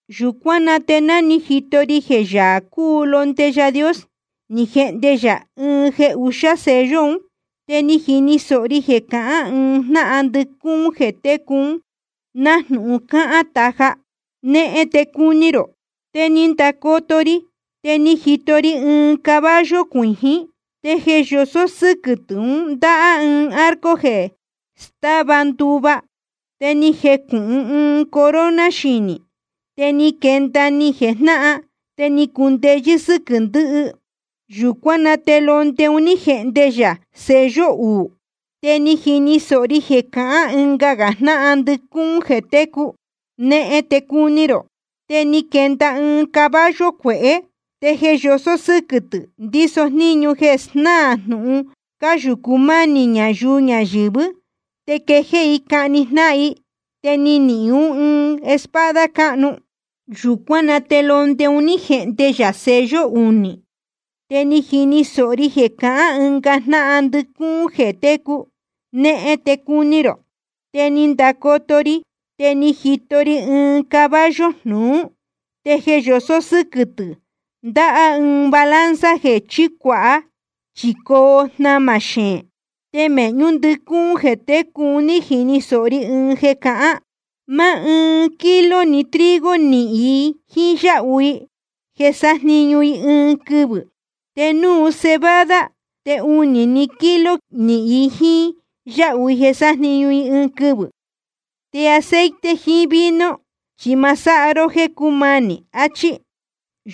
Yūcuán na te ni jito ri jeē Yaā cúu Londe Yaā Dios, ni jehnde yā ɨɨn jeē uxá sello un. Te ni jini sōho ri jeē cahán ɨɨn jnáhan ndɨcúún jeē técu ún, nájnūhun cáhán taja: Nehen te cuni rō. Te ni ndacoto ri, te ni jito ri ɨɨn caballo cuijín. Te jeē yosó sɨ́quɨ̄ tɨ̄ un ndáhá ɨɨn arco jeē stáva nduva. Te ni jecūhun ɨɨn corona xinī. Te ni quenda ni jejnáhan, te ni cundeyɨ́ sɨ́quɨ̄ ndɨhɨ. Yūcuán na te Londe un ní jehnde yā sello uū. Te ni jini sōho ri jeē cahán ɨnga jnáhan ndɨcúún jeē técu: Nehen te cuni rō. Te ni quenda ɨɨn caballo cuehé, te jeē yosó sɨ́quɨ̄ tɨ̄ ndíso jníñu jeē snáā jnūhun cáyūcu mánī ñayuu ñayɨ̄vɨ́, te quejéé i cahni jnáhan i. Te ni nihīn ún ɨɨn espada cáhnu. Yūcuán na te Londe un ní jehnde yā sello unī. Te ni jini sōho ri jeē cahán ɨnga jnáhan ndɨcúún jeē técu: Nehen te cuni rō. Te ni ndacoto ri, te ni jito ri ɨɨn caballo jnuú. Te jeē yosó sɨ́quɨ̄ tɨ̄ ndáhá ɨɨn balanza jeē chícuāha, chi coo jnamā xeēn. Te mēhñú ndɨcúún jeē técu un ní jini sōho ri ɨɨn jeē cahán: Máá ɨɨn kilo‑ni trigo nihīn i jíín yáhu i jeē sájniñu i ɨɨn quɨvɨ̄. Te núu cebada, te unī‑ni kilo nihīn i jíín yáhu i jeē sájniñu i ɨɨn quɨvɨ̄. Te aceite jiín vino chi ma sáha ró jéē cúmanī. Achí.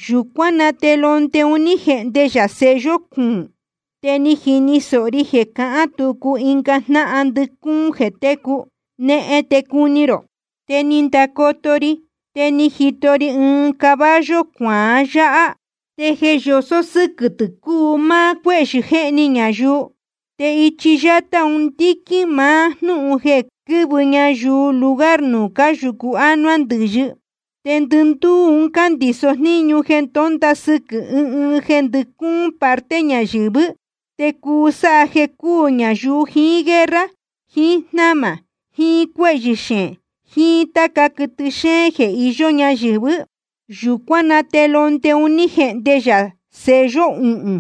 Yūcuán na te Londe un ní jehnde yā sello cuūn. Te ni jini sōho ri jeē cahán tucu ɨnga jnáhan ndɨcúún jeē técu: Nehen te cuni rō. Te ni ndacoto ri, te ni jito ri ɨɨn caballo cuaán yaa, te jeē yosó sɨ́quɨ̄ tɨ̄ cúu máá cuéhyɨ̄ jéhni ñayuu. Te ichi yátá un ndíquín máá jnúhun jeē quɨ́vɨ ñayuu lugar nuū cáyūcu ánuá ndɨ̄yɨ. Te ndɨndúú un cándiso jníñu jeē ndónda sɨquɨ̄ ɨɨn jeē ndɨcúún parte ñayɨ̄vɨ́, te cuu sáha jeē cúū ñayuu jiín guerra, jiín jnámā, jiín cuéhyɨ̄ xeén, jiín táca quɨtɨ xéén jeē iyó ñayɨ̄vɨ́. Yūcuán na te Londe un ní jehnde yā sello uhūn.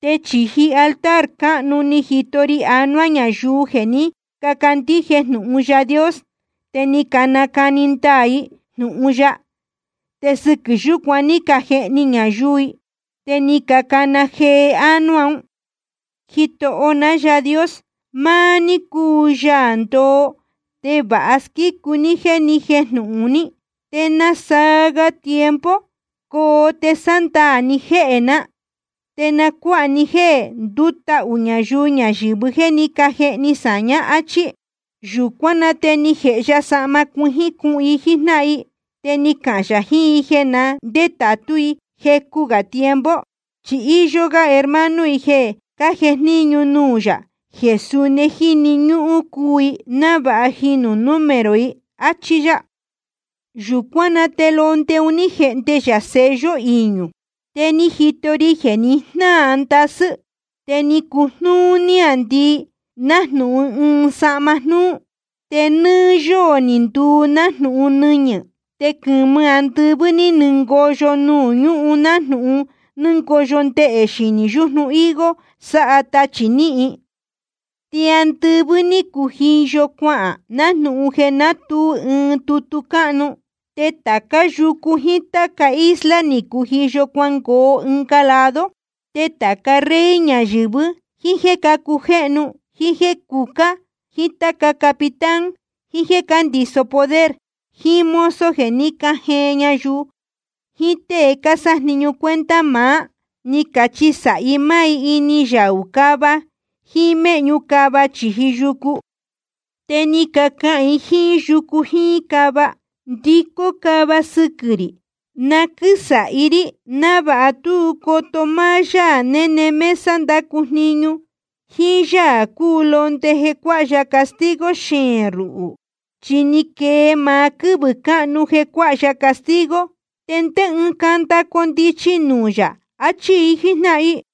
Te chīji altar cáhnu ni jito ri anuá ñayuu jeē ní cacandíje jnūhun Yaā Dios te ni canacani ndaā i jnūhun ya, te sɨquɨ̄ yūcuan ní cajehni ñayuu i. Te ni cacana jee ánuá un: Jitoho ná Yaā Dios, maá ní cúu Yaā ndoo te vāha squícu ní jéē ni jéjnūhun ní. ¿Te nasaa ga tiempo coo te sándaā ni jéhē ná, te nacuāha ní jéē ndútahū ñayuu ñayɨ̄vɨ jéē ní cajehni sāñá? áchí. Yūcuán na te ni jēhe ya sahma cuijín cuhun i jíjnáhan i, te ni cahān yā jiín i jeē na ndétātú i jecu gā tiempo. Chi íyó gá hermano i jeē cájejníñu nuū yā, jeē suni jíni ñúhún cuu i návāha jīnu número i, áchí yá. Yūcuán na te Londe un ní jehnde yā sello iñū. Te ni jito ri jeē ni jnáa ndasɨ́. Te ni cujnúú níāndii nájnūhun ɨɨn sahma jnúú. Te nɨ́ɨ́ yóō ni nduu nájnūhun nɨñɨ̄. Te quɨ̄mɨ andɨvɨ́ ní nɨngoyo nuū ñúhun nájnūhun nɨ́ngoyo ndehē yɨ̄hɨ́ yujnu higo sáha tachī níhin. Te andɨvɨ́ ní cujiyo cuahān nájnūhun jeē nátuu ɨɨn tutu cáhnu. Te tācá yucu jíín táca isla ni cujiyo cuangoo ɨnga lado. Te tāca rey ñayɨ̄vɨ́, jíín jéē cácujéhnu, jíín jéē cucá, jíín táca capitán, jiín jéē cándiso poder, jiín mozo jeē ní cajeen ñayuu, jiín tée cásájniñu cuenta maá, ní cachisāhi máá ini yaū cava jíín méhñu cava chīji yucu. Te ni cacahān i jíín yucu jíín cava: Ndicó cáva sɨquɨ̄ rī, na quɨ́sāhi rí návāha tú coto máá Yaā néne mesa ndácu jniñu, jíín Yaā cúu Londe jeē cuáha ya castigo xeēn ruhū. Chi ni quee maá quɨ́vɨ̄ cáhnu jeē cuáha ya castigo, ¿te ndé ɨɨn canda condichi nuū yā? achí i jíjnáhan i.